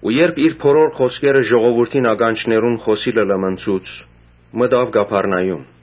Երբ իր բոլոր խօսքերը ժողովուրդին ականջներուն խօսիլը լմնցուց, մտաւ Կափառնայում։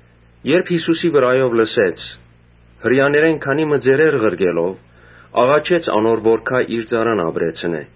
Երբ Յիսուսի մասին լսեց, Հրեաներէն քանի մը ծերեր ղրկելով՝ աղաչեց անոր որ գայ իր ծառան ապրեցնէ։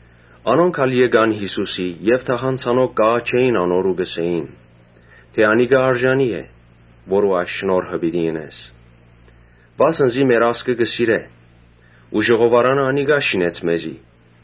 Անոնք ալ եկան Յիսուսին եւ թախանձանքով կ’աղաչէին անոր ու կ’ըսէին թէ՝ «Անիկա արժանի է՝ որուն այս շնորհքը պիտի ընես, Վասն զի մեր ազգը կը սիրէ ու ժողովարանը անիկա շինեց մեզի»։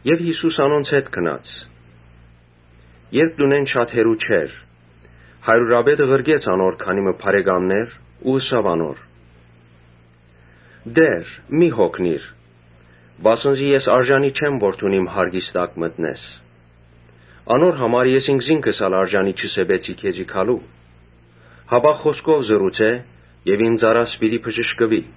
Յիսուս գնաց անոնց հետ ու երբ տան մօտեցան՝ հարիւրապետը քանի մը բարեկամներ ղրկեց ու ըսաւ անոր. «Տէ՛ր, մի՛ յոգնիր, վասն զի ես արժանի չեմ որ դուն իմ յարկիս տակ մտնես։ Անոր համար ես ինքզինքս ալ արժանի չսեպեցի քեզի գալու, հապա խօսքով ըսէ եւ իմ ծառաս պիտի բժշկուի։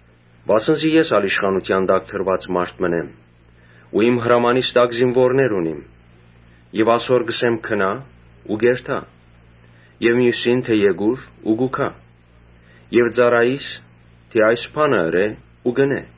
Վասն զի ես ալ իշխանութեան տակ դրուած մարդ մըն եմ ու իմ հրամանիս տակ զինուորներ ունիմ։ Ասոր կ’ըսեմ՝ ‘Գնա՛’ ու կ’երթայ. եւ միւսին՝ թէ ‘Եկո՛ւր’, կու գայ եւ ծառայիս՝ թէ ‘Այս բանը ըրէ’ ու կ’ընէ»։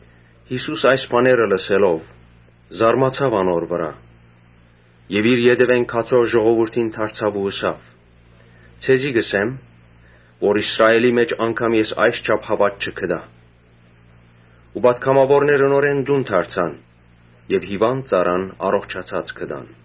Յիսուս այս բաները լսելով՝ զարմացաւ անոր վրայ եւ իր ետեւէն գացող ժողովուրդին դարձաւ ու ըսաւ. «Ձեզի կ’ըսեմ, թէ Իսրայէլի մէջ անգամ ես այսչափ հաւատք չգտայ»։ Ու պատգամաւորները նորէն տուն դարձան եւ հիւանդ ծառան առողջացած գտան։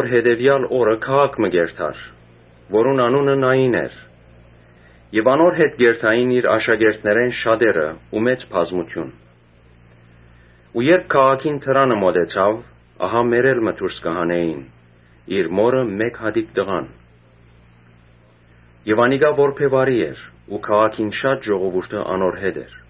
Հետեւեալ օրը քաղաք մը կ’երթար, որուն անունը Նային էր։ Անոր հետ կ’երթային իր աշակերտներէն շատերը ու մեծ բազմութիւն մը։ Երբ քաղաքին դրանը մօտեցաւ, մեռել մը դուրս կը հանէին, իր մօրը մէկ հատիկ տղան։ Մայրը որբեւարի էր։ Քաղաքէն շատ ժողովուրդ անոր հետ էր։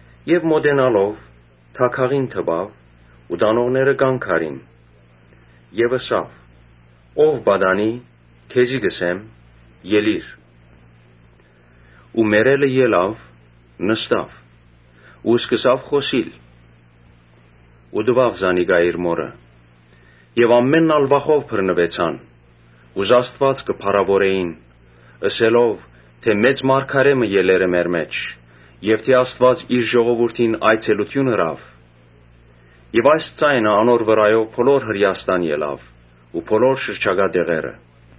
Մօտենալով՝ դագաղին դպաւ ու տանողները կանգ առին. եւ ըսաւ. «Ո՛վ պատանի, քեզի կ’ըսեմ, Ելի՛ր»։ Ու մեռելը ելաւ նստաւ ու սկսաւ խօսիլ։ Յիսուս տուաւ զանիկա իր մօրը։ Եւ ամէնքն ալ վախով բռնուեցան ու Աստուած կը փառաւորէին՝ ըսելով. «Մեծ մարգարէ մը ելեր է մեր մէջ եւ թէ Աստուած իր ժողովուրդին այցելութիւն ըրաւ»։ Եւ այս ձայնը անոր վրայով բոլոր Հրէաստան ելաւ ու բոլոր շրջակայ տեղերը։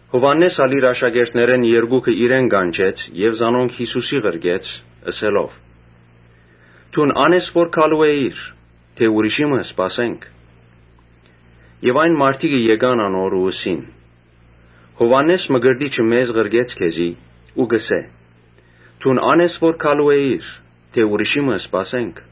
Յովհաննէս ալ իր աշակերտներէն երկուքը իրեն կանչեց եւ զանոնք Յիսուսին ղրկեց՝ ըսելով. «Դուն ա՞ն ես որ գալու էր, թէ ուրիշի մը սպասենք»։ Աշակերտները գացին անոր ու ըսին. «Յովհաննէս Մկրտիչը մեզ ղրկեց քեզի ու կը հարցնէ. ‘Դուն ա՞ն ես որ գալու էր, թէ ուրիշի մը սպասենք’»։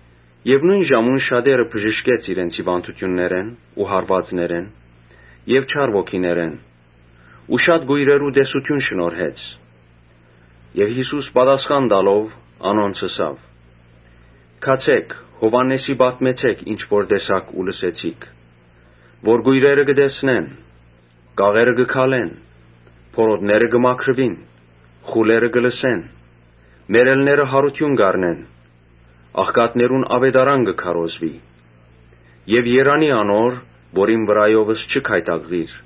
Նոյն ժամուն շատեր բժշկեց իրենց հիւանդութեններէն ու հարուածներէն եւ չար ոգիներէն ու շատ կոյրերու տեսութիւն շնորհեց։ Ապա Յիսուս պատասխան տալով՝ անոնց ըսաւ. «Գացէք Յովհաննէսին պատմեցէք ինչ որ տեսաք ու լսեցիք, թէ կոյրերը կը տեսնեն, կաղերը կը քալեն, բորոտները կը մաքրուին, խուլերը կը լսեն, մեռելները յարութիւն կ’առնեն, աղքատներուն աւետարան կը քարոզուի։ Երանի՜ անոր որ իմ վրայովս չի գայթակղիր»։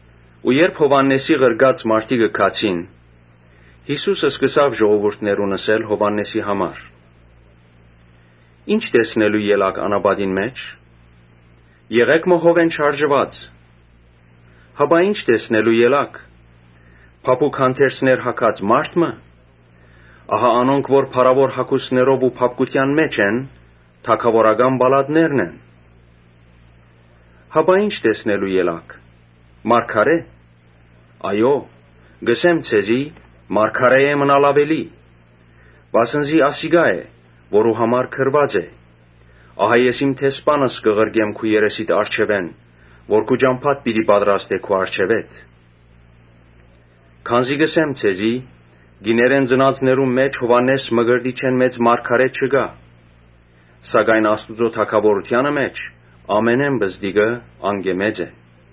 Երբ Յովհաննէսին ղրկած մարդիկը գացին, Յիսուս ժողովուրդին ըսաւ Յովհաննէսին համար. «Ի՞նչ տեսնելու ելաք անապատին մէջ. եղէ՞գ մը հովէն շարժուած։ Հապա ի՞նչ տեսնելու ելաք. փափուկ հանդերձներ հագած մա՞րդ մը։ Ահա անոնք որ փառաւոր հագուստներով ու փափկութեան մէջ են, թագաւորական պալատներն են։ Հապա ի՞նչ տեսնելու ելաք. մարգարէ՞. «Այո՛, կ’ըսեմ ձեզի, մարգարէէ մը աւելի»։ Վասն զի ասիկա է՝ որուն համար գրուած է. ‘Ահա ես իմ դեսպանս կը ղրկեմ քու երեսիդ առջեւէն, որ քու ճամբադ պիտի պատրաստէ քու առջեւէդ’։ Քանզի կ’ըսեմ ձեզի. ‘Կիներէն ծնածներուն մէջ Յովհաննէս Մկրտչէն մեծ մարգարէ չկայ’. սակայն Աստուծոյ թագաւորութեանը մէջ ամենէն պզտիկը անկէ մեծ է»։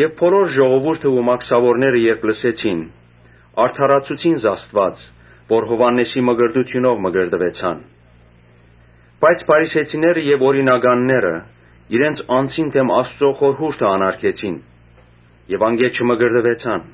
Բոլոր ժողովուրդը ու մաքսաւորները երբ լսեցին, Աստուած արդարացուցին, որ Յովհաննէսին մկրտութիւնով մկրտուեցան։ Բայց փարիսեցիները եւ օրինականները իրենց անձին դէմ Աստուծոյ խորհուրդը անարգեցին եւ անկէ չմկրտուեցան։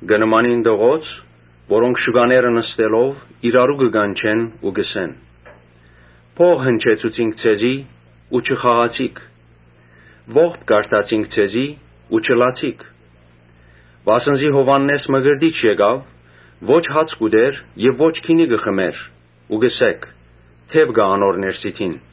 Կը նմանին տղոց, որոնք շուկաները նստելով՝ իրարու կը կանչեն ու կ’ըսեն. ‘Փող հնչեցուցինք ձեզի ու չխաղացիք։ Ողբ կարդացինք ձեզի ու չլացիք’։ Վասն զի Յովհաննէս Մկրտիչ եկաւ, ո՛չ հաց կ’ուտէր եւ ո՛չ գինի կը խմէր ու կ’ըսէիք. ‘Դեւ կայ անոր ներսիդին’։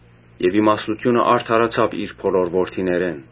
Իմաստութիւնը արդարացաւ իր բոլոր որդիներէն»։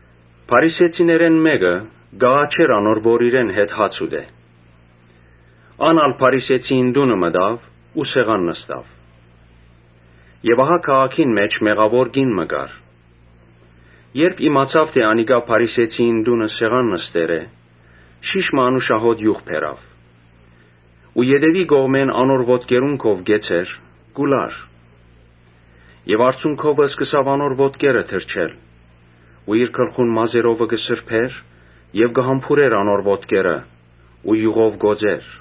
Փարիսեցիներէն մէկը կ’աղաչէր անոր, որ իրեն հետ հաց ուտէ։ Ան ալ փարիսեցիին տունը մտաւ ու սեղան նստաւ։ Քաղաքին մէջ մեղաւոր կին մը կար. երբ իմացաւ թէ անիկա փարիսեցիին տունը սեղան նստեր է, շիշ մը անուշահոտ իւղ բերաւ։ Ու ետեւի կողմէն անոր ոտքերուն քով կեցեր՝ կու լար եւ արցունքովը սկսաւ անոր ոտքերը թրջել ու իր գլխուն մազերովը կը սրբէր եւ կը համբուրէր անոր ոտքերը ու իւղով կ’օծէր։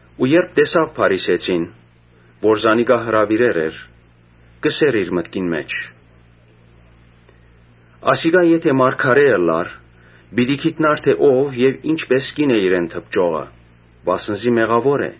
Ու երբ տեսաւ փարիսեցին, որ զանիկա հրաւիրեր էր, ըսաւ իր մտքին մէջ. «Ասիկա եթէ մարգարէ ըլլար, պիտի գիտնար թէ ո՞վ եւ ի՞նչպիսի կին է իրեն դպչողը, վասն զի մեղաւոր է»։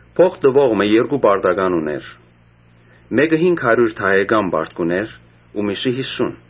«Փոխ տուող մը երկու պարտական ունէր, մէկը հինգ հարիւր դահեկան պարտք ունէր ու միւսը՝ յիսուն։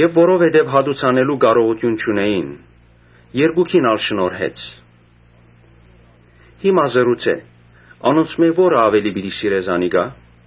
Որովհետեւ հատուցանելու կարողութիւն չունէին, երկուքին ալ շնորհեց։ Հիմա ըսէ. ‘Անոնցմէ ո՞րը աւելի պիտի սիրէ զանիկա’»։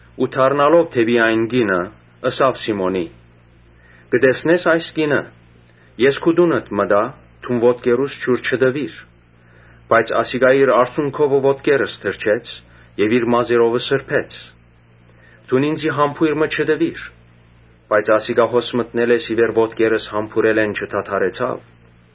Ու դառնալով դէպի այն կինը՝ ըսաւ Սիմոնին. «Կը տեսնե՞ս այս կինը։ Ես քու տունդ մտայ, դուն ոտքերուս ջուր չտուիր, բայց ասիկա իր արցունքովը ոտքերս թրջեց եւ իր Ոմանք, գլխուն մազերովըմազերովը սրբեց։ Դուն ինծի համբոյր մը չտուիր, բայց ասիկա հոս մտնելէս ի վեր ոտքերս համբուրելէն չդադրեցաւ։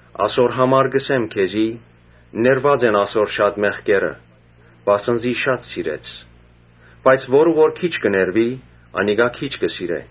Ասոր համար կ’ըսեմ քեզի. ‘Ներուած են ասոր շատ մեղքերը, վասն զի շատ սիրեց, բայց որուն որ քիչ կը ներուի, անիկա քիչ կը սիրէ’.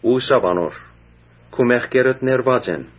Ու ըսաւ անոր. «Քու մեղքերդ ներուած են»։